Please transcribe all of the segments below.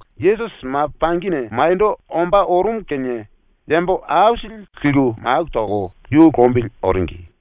Yesusi ma pangine maniendo ombá orumu kinie yambo aisili liku maku toko yu lombili oringi.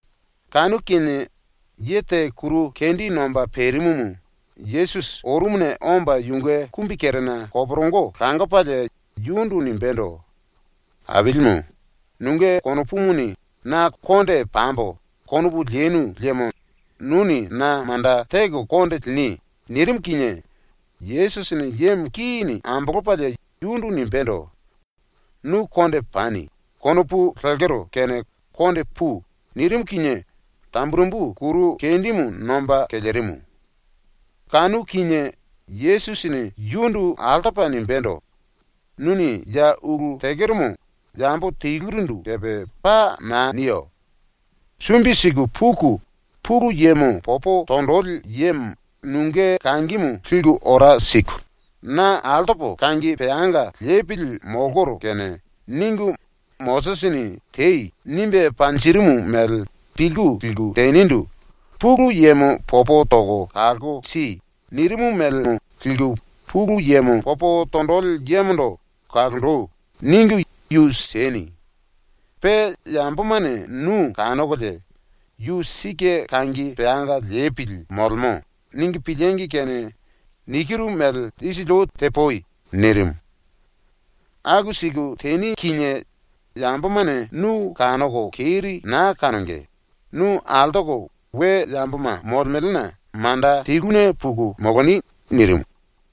Kanu kinie ye te kuru kendi nomba perimumu Yesusi orumuna omba yunge kumbikerena koporongo langopalie yundu nimbendo: “Ailimu, nunge konopumuni na ‘konde pambo.’ konopu lenu liemo nuni na manda teko konde lini.” nirimu kinie Yesusini yemo kini ambolopalie yundu nimbendo: “‘Nu konde pani.’ konopu lekero kene konde pui.” nirimu kinie tamburembu kuru kendimu nomba kelerimu. Kanu kinie Yesusini yundu altopa nimbendo: “Nuni ya ulu tekeromo yambo telurindu kepe paa naa niyo. Sumbi siku puku Pulu Yemo popo tonjili yemo nunge kangimu liku ora siku, ‘Na altopo kangi peanga lepili molkoro kene.’ ningu Mosisini “Tei.” nimbe panjirimu mele pilku liku tenindu “Pulu Yemo popo toko kalko si.” nirimu mélemo liku Pulu Yemo popo tonjili yemondo “Kalonji.” ningu yu sieni. Pe yambomane nu kanokolie ‘Yu sike kangi peanga lepili molemo.’ ningu piliengi kene nikiru mele isili ou tepui.” nirimu. ⸤“Aku siku teni kinie yambomane nu kanoko keri naa kanonge, nu altoko we yamboma molemelena manda teluna puku moloni.” nirimu.⸥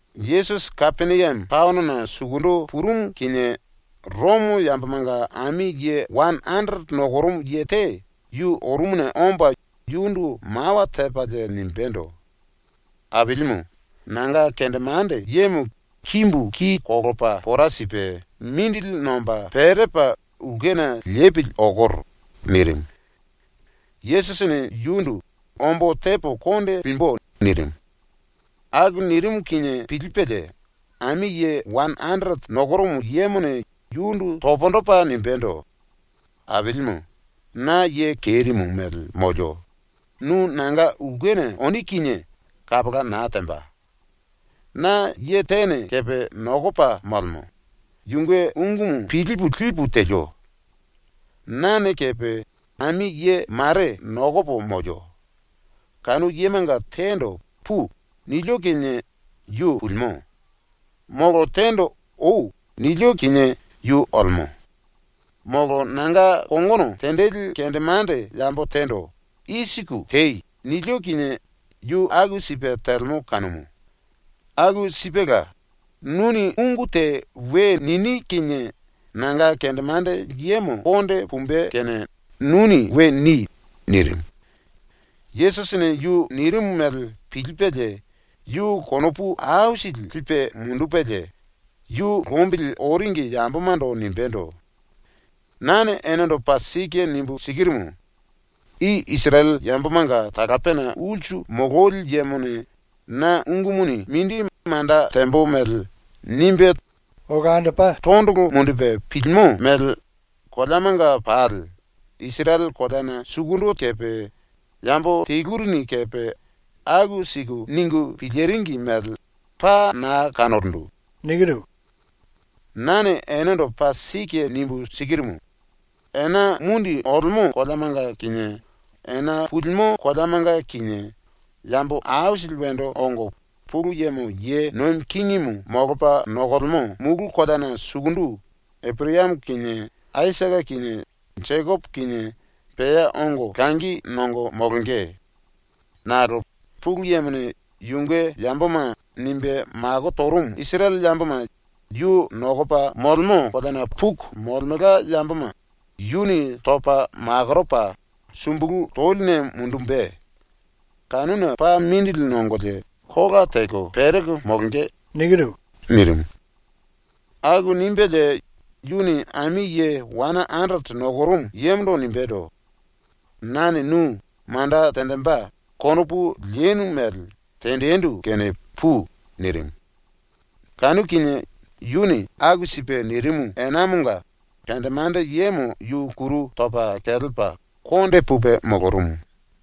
Yesusi Kapeniame taonona sukundu purumu kinie Romo yambomanga ami ye wane anderete nokorumu ye te yu orumuna omba yundu mawa tepalie nimbendo: “Ailimu, nanga kendemande yemo kimbu ki kolopa pora sipe mindili nomba perepa ulkena lepili okoro.” nirimu. Yesusini yundu “Ombo tepo konde limbu.” nirimu. ⸤Aku nirimu kinie pilipelie⸥ ami ye wane anderete nokorumu yemone yundu pundu topa nimbendo: “Ailimu, na ye kerimu mele molio, nu nanga ulkena oni kinie kapola naa temba. Na ye tene kepe nokopa molemo, yunge ungumu pilipu lipu telio. Nane kepe ami ye mare nokopo molio. Kanu yemanga tendo “Pui.” nilio kinie yu pulimo. Molo tendo “Oi.” nilio kinie yu olemo. Molo nanga kongono tenjili kendemande yambo tendo “I siku tei.” nilio kinie yu aku sipe telemo kanumu. Aku sipela, nuni ungu te we nini kinie nanga kendemande yemo konde pumbe kene nuni we ni.” nirimu. Yesusini yu nirimu mele pilipelie yu konopu aisili lipe mundupelie yu lombili oringi yambomando nimbendo: “Nane enendo paa sike nimbu sikirumu: I Isirele yambomanga talapena ulsu mololi yemone na ungumuni mindi manda tembo mele nimbe tondolo mundupe pilimo mele koleamanga pali, Isirele koleana sukundu kepe, yambo telurini kepe aku siku ningu piliringi mele paa na kanorundu. Nane enendo paa sike nimbu sikirumu: Ena mundi olemo koleamanga kinie ena pulimo koleamanga kinie yambo aisili wendo ongo Pulu Yemo ye nomi kingimu molopa nokolemo mulu koleana sukundu Eporayamo kinie Aisake kinie Jekopo kinie pea ongo langi nongo molonge. Nakolo Pulu Yemone ‘yunge yamboma’ nimbe mako torumu ⸤Isirele⸥ yamboma yu nokopa molemo koleana puku molemelka yamboma yuni topa makoropa sumbulu toline mundumbe. Kanuna paa mindili nongolie kola teko pereko molonge.” nirimu. Aku nimbelie yuni ami ye wane anderete nokorumu yemondo nimbendo: “Nane nu ‘manda tenjimbe’ konopu lenu mele tenjindu kene pui.” nirimu. Kanu kinie yuni aku sipe nirimu enamonga kendemande yemo yu kuru topa kelepa konde pupe molorumu.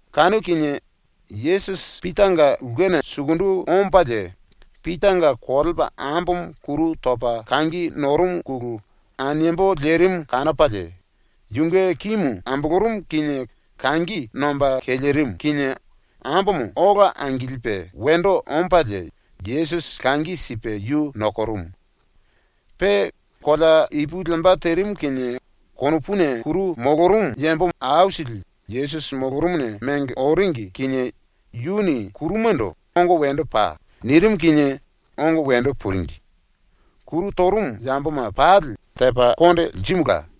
⸤Kanu kinie⸥ Yesusi Pitanga ulkena sukundu ombalie Pitanga kolepa ambomo kuru topa kangi norumuna aniembo lerimu kanopalie, yunge kimu ambolorumu kinie kangi nomba kelerimu kinie ambomo ola angilipe wendo ombalie Yesusi langi sipe yu nokorumu. Pe kolea ipu lemba terimu kinie konopuna kuru molorumu yambo aisili Yesusi molorumuna mengo oringi kinie yuni kurumando “Ongo wendo pai.” nirimu kinie ongo wendo puringi. Kuru torumu yamboma pali tepa konde lirimula.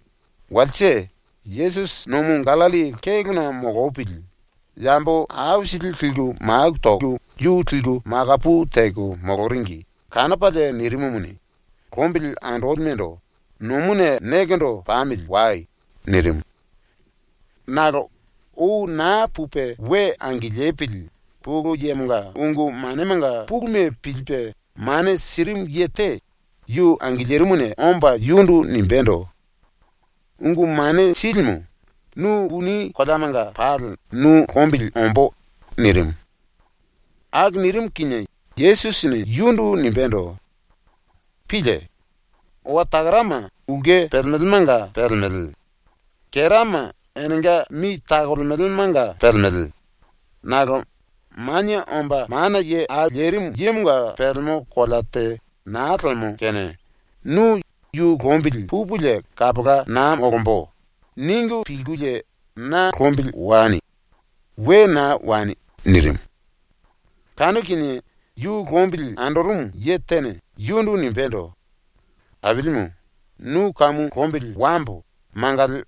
⸤Walse⸥ Yesusi ⸤nomu Gallilli kélona molopili⸥ yambo aisili liku maku toko yu liku makaye teko moloringi kanopalie nirimumuni, ⸤lombili andolimendo⸥ “Nomuna nekendo pamili wai.” nirimu. ⸤Nakolo ou naa pupe we angilipili⸥ Pulu Yemonga ungu manemanga puluma pilipe mane sirimu ye te yu angilirimuna omba yundu nimbendo: “Ungu Mane Silimu, nu puni koleamanga pali nu lombili ombó.” nirimu. ⸤Aku nirimu kinie⸥ Yesusini yundu nimbendo: “Pílie! Owa takarama ulke pelemelemanga pelemele; kerama enenga mi takolemelemanga pelemele, nakolo Manie Omba Mana Ye Au Lerimu Yemonga pelemo kolea te naa lemo ⸤kene, nu ‘Yu lombili pupulie kapola naa molombo.’ ningu pilkulie na lombili wani. We naa wani.⸥” nirimu. Kanu kinie yu lombili andorumu ye tene yundu nimbendo: “Ailimu, nu kamu lombili wambo mangali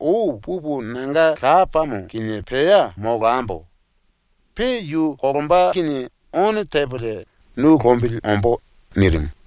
ou pupu nanga lapamo ⸤kinie pea molambo. Pe yu kolomba kinie⸥ ono tepolie nu lombili ombó.” nirimu.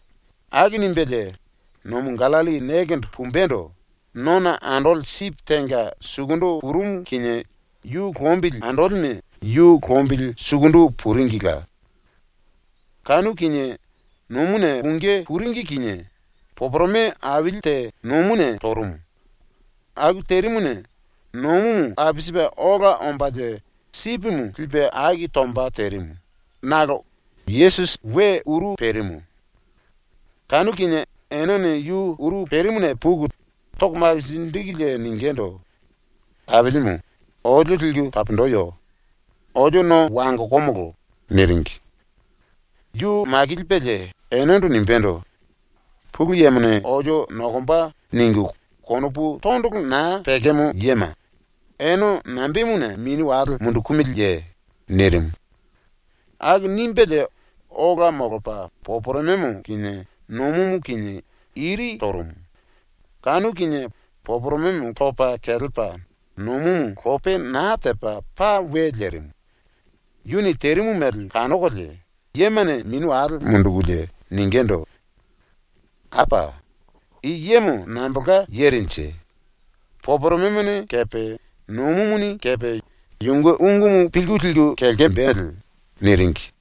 Aku nimbelie ⸤nomu Gallilli nekendo pumbendo⸥ nona andoli sipi tenga sukundu purumu kinie yu lombili andolime yu lombili sukundu puringila. Kanu kinie ⸤nomuna pungí puringi kinie⸥ poporome aili te nomuna torumu. Aku terimuna nomumu apisipe ola ombalie sipimu lipe aki tomba terimu nakolo Yesusi we uru perimu. Kanu kinie enene yu uru perimuna puku toko makinjikulie ningindu: “Ailimu, olio liku taponjiyo. Olio no wangokomolo.” niringi. Yu ⸤makilipelie⸥ enendo nimbendo: “‘Pulu Yemone olio nokomba.’ ningu konopu tondolo naa pekemo yema, ene nambemuna mini wale mundukumiliye?” nirimu. Aku nimbelie ola molopa poporomemo kinie nomumu kinie iri torumu. Kanu kinie poporomemo topa kelepa nomumu lope naa tepa paa we lerimu. ⸤Yuni terimu mele kanokolie⸥ yemane mini wale mundukulie ningindu: “Apa! I yemo nambolka yerenje? Poporomemone kepe nomumuni kepe yunge ungumu pilku liku kelkembele.” niringi.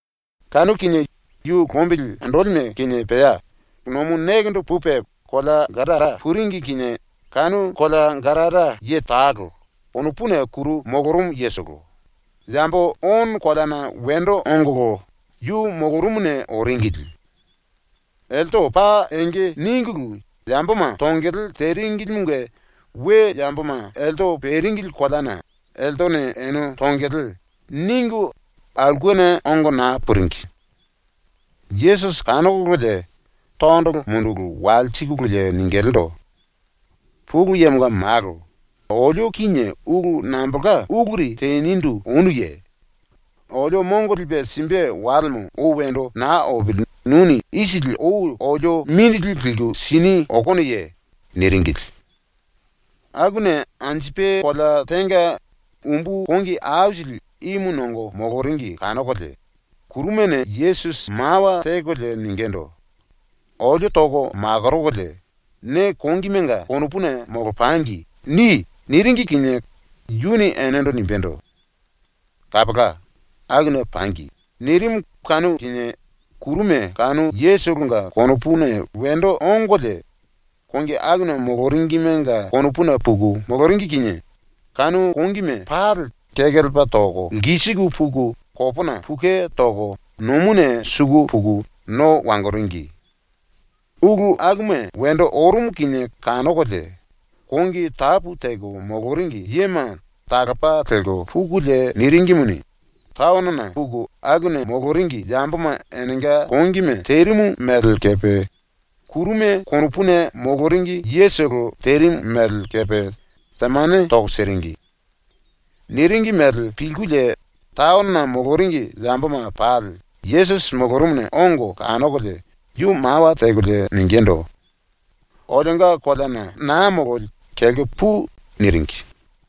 Kanu kinie yu ⸤lombili andolime kinie pea⸥ nomu nekendo pupe kolea Gadara puringi kinie kanu kolea Gadara ye talo, konopuna kuru molorumu yetolo, yambo ono koleana wendo ongolo yu molorumuna oringili. Elte paa enge ningulu yamboma tongele teringilimunge we yamboma elte peringili koleana ‘Eltene ene tongele.’ ningu aulkena ongo naa puringi. Yesusi kanokololie tondolo munduku walsikululie ningilindu: “Pulu Yemonga Malo, olio kinie ulu nambolka uluri tenindu onuye? Olio mongo lipe simbe walemo ou wendo naa opili nuni isili ou olio mindili liku sini okonoye?” niringili. Akuna anjupe kolea tenga umbu kongi aisili ímu nongo moloringi ⸤kanokolie⸥ kurumane Yesusi mawa tekolie ningindu: “Olio toko makorokolie ‘ne kongimenga konopuna molopangi.’ ni.” niringi kinie Yuni enendo nimbendo: “Kapola, akuna pangi.” nirimu kanu kinie ⸤kuruma⸥ kanu yetolonga konopuna wendo ongolie kongi akuna moloringimenga konopuna puku moloringi kinie kanu kongime pali kekelepa toko lkisiku puku kopona pukue toko nomuna suku puku no wangoringi. ⸤Ulu akuma wendo orumu kinie kanokolie⸥ kongi tapu teko moloringi yema talopa lelko pukulie niringimuni, taonona puku akuna moloringi yamboma enenga kongime terimu mele kepe kuruma konopuna moloringi yetolo terimu mele kepe temane toko siringi. Niringi mele pilkulie taonona moloringi yamboma pali Yesusi molorumuna ongo kanokolie yu mawa tekolie ningindu: “Olionga koleana naa mololi kelko pui.” niringi.